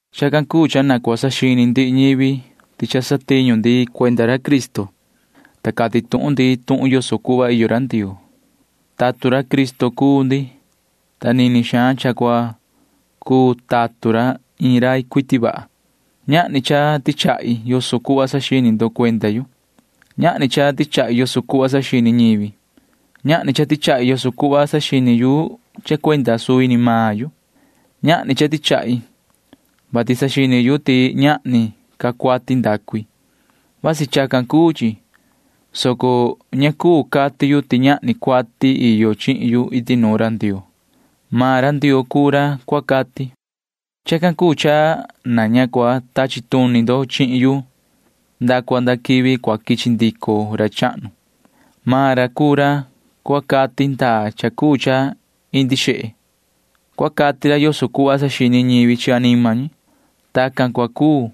Chacan cuu cha na cua saxini ndihi ñivi ti cha satiñu ndi cuenda ra Cristo, ta cati tuhun ndi tuhun yoso cuhva iyo ra Ndioo. Tatun ra Cristo cuu ndi, ta nini xaan cha cuu tatun ra iin rai cuiti vaha. Ñahni cha tichahi yoso cuhva saxini ndo cuenda yu. Ñahni cha tichahi yoso cuhva saxini ñivi. Ñahni cha tichahi yoso cuhva saxini yu cha cuenda suvi ni maan yu. Ñahni cha tichahi, vati saxini yu ti ñahni ca cuati ndacu i. Vasi chacan cuu chi, soco ña cuu cati yu ti ñahni cuati iyo chihin yu iti nuun ra Ndioo. Maan ra Ndioo cuu ra cua cati. Chacan cuu cha na ña cua tachi tuni ndo chihin yu nda cua nda quivi cua quichi ndico ra chahnu. Maan ra cuu ra cua cati ndaa cha cuu cha indi xehe. Cua cati ra yoso cuhva saxini ñivi chi anima ñi. Tacan cua cuu,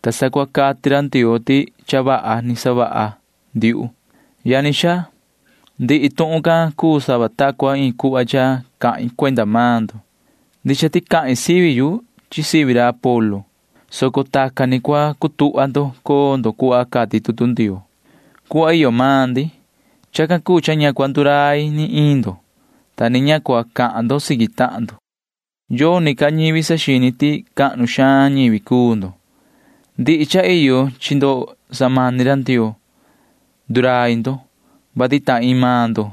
ta sa cua cati ra Ndioo ti cha vaha ni savaha ndiuhu. Yani xaa, ndihi tuhun can cuu sava ta cua iin cuhva cha cahin cuenda maan ndo. Ndicha ti cahin sivi yu chi sivi ra Apolo, soco tacan ni cua cutuhva ndo coo ndo cuhva cati tutu Ndioo, cuhva iyo maan ndi. Chacan cuu cha ña cua ndurai ni iin ndo, ta ni ña cua cahan ndo siqui tahan ndo. Yoni ca ñivi saxini ti cahnu xaan ñivi cuu ndo. Ndihi cha iyo chi ndo samani ra Ndioo. Ndurai ndo, vati ta iin maan ndo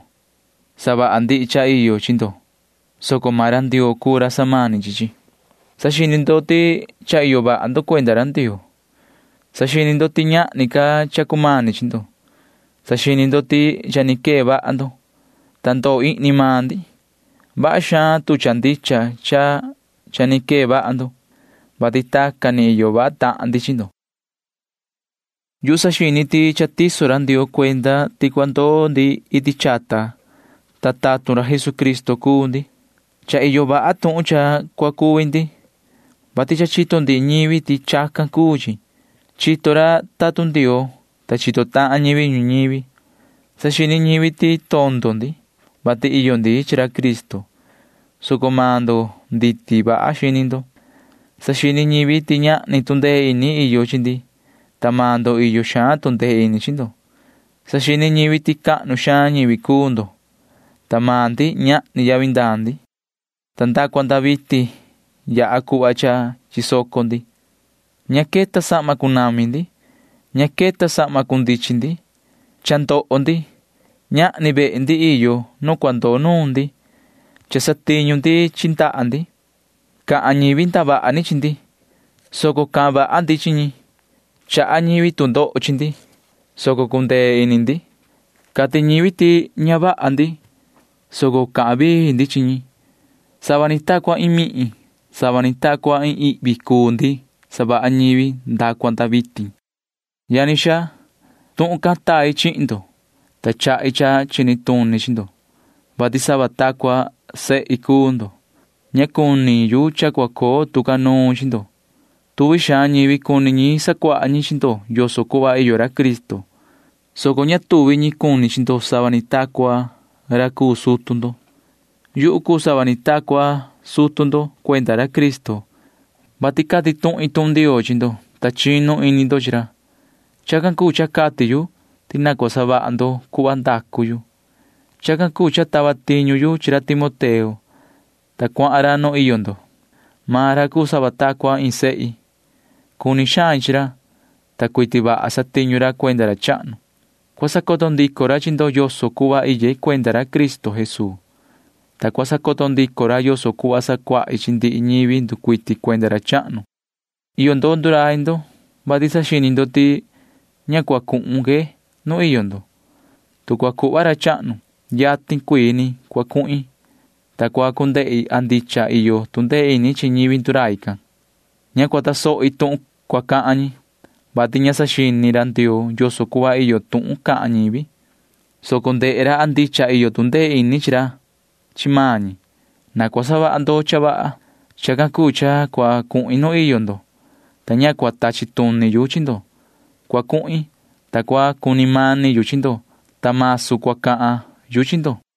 savaha ndihi cha iyo chi ndo, soco maan ra Ndioo cuu ra samani chi chi. Saxini ndo ti cha iyo vaha ndo cuenda ra Ndioo. Saxini ndo ti ñahni ca cha cumani chi ndo. Saxini ndo ti cha ni quee vaha ndo, ta ndoo ihni maan ndi. Vaha xaan tu cha ndicha cha cha ni quee vaha ndo, vati tacan ni iyo vaha tahan ndi chi ndo. Yuhu saxini ti cha tiso ra Ndioo cuenda ti cua ndoo ndi iti chata, ta tatun Jesucristo cuu ndi. Cha iyo vaha tuhun cha cua cuvi ndi, vati cha chito ndihi ñivi ti chacan cuu chi. Chito ra tatun Ndioo, ta chito tahan ñivi ñuñivi. Saxini ñivi ti tondo ndi, vati iyo ndi chi ra Cristo, soco maan ndo nditi vaha xini ndo. Saxini ñivi ti ñahni tu ndee ini iyo chi ndi, ta maan ndo iyo xaan tu ndee ini chi ndo. Saxini ñivi ti cahnu xaan ñivi cuu ndo, ta maan ndi―ñahni yavi ndaa ndi. Nda cua nda vitin yaha cuhva cha chisoco ndi. Ña queta sahma cunami ndi. Ña queta sahma cundichin ndi. Cha ndoho ndi. Ñahni vehe ndi iyo nu cua ndoo nuun ndi. Cha satiñu ndi chi ndaha ndi. Cahan ñivi ndavaha ni chi ndi, soco cahan vaha ndi chi ñi. Chaha ñivi tu ndoho chi ndi, soco cundee ini ndi. Cati ñivi ti ña vaha ndi, soco cahan vii ndi chi ñi. Sava ni ta cua iin mihin, sava ni ta cua iin ihvi cuu ndi savaha ñivi nda cua nda vitin. Yani xaa, tuhun can tai chihin ndo, ta chahi cha chini tuni chi ndo, vati sava ta cua sehi cuu ndo. Ña cuni yu cha cua coo tu ca nuun chi ndo. Tuvi xaan ñivi cuni ñi sacuaha ñi chi ndo yoso cuhva iyo ra Cristo, soco ña tuvi ñi cuni chi ndo sava ni ta cua ra cuu sutu ndo. Yuhu cuu sava ni ta cua sutu ndo cuenda ra Cristo, vati cati tuhin tuhun Ndioo chi ndo, [ta chinu ini ndo chi ra]. Chacan cuu cha cati yu ti na cua savaha ndo cuhva ndacu yu. Chacan cuu cha tava tiñu yu chi ra Timoteo, ta cuahan ra nu iyo ndo. Maan ra cuu sava ta cua iin sehi. Cuni xain chi ra, ta cuiti vaha satiñu ra cuenda ra chahnu. Cua sacoto ndico ra chi ndo yoso cuhva iye cuenda ra Cristo Jesuu, ta cua sacoto ndico ra yoso cuhva sacuahi chi ndihi ñivi nducuiti cuenda ra chahnu. Iyo ndo ndurai ndo, vati saxini ndo ti ña cua cuhun que nu iyo ndo. Tu cua cuhva ra chahnu, yatin cuii ni cua cuhin, ta cua cu ndehi a ndicha iyo tu ndee ini chi ñivi ndurai can. Ña cua tasohi tuhun cua cahan ñi, vati ña saxini ra Ndioo yoso cuhva iyo tuhun cahan ñivi, soco ndehe ra a ndicha iyo tu ndee ini ra chi maan ñi. Na cua savaha ndo cha vaha. Chacan cuu cha cua cuhin nu iyo ndo, ta ña cua tachi tuni yu chi ndo. Cua cuhin, ta cua cuni mani yu chi ndo, ta masu cua cahan yu chi ndo.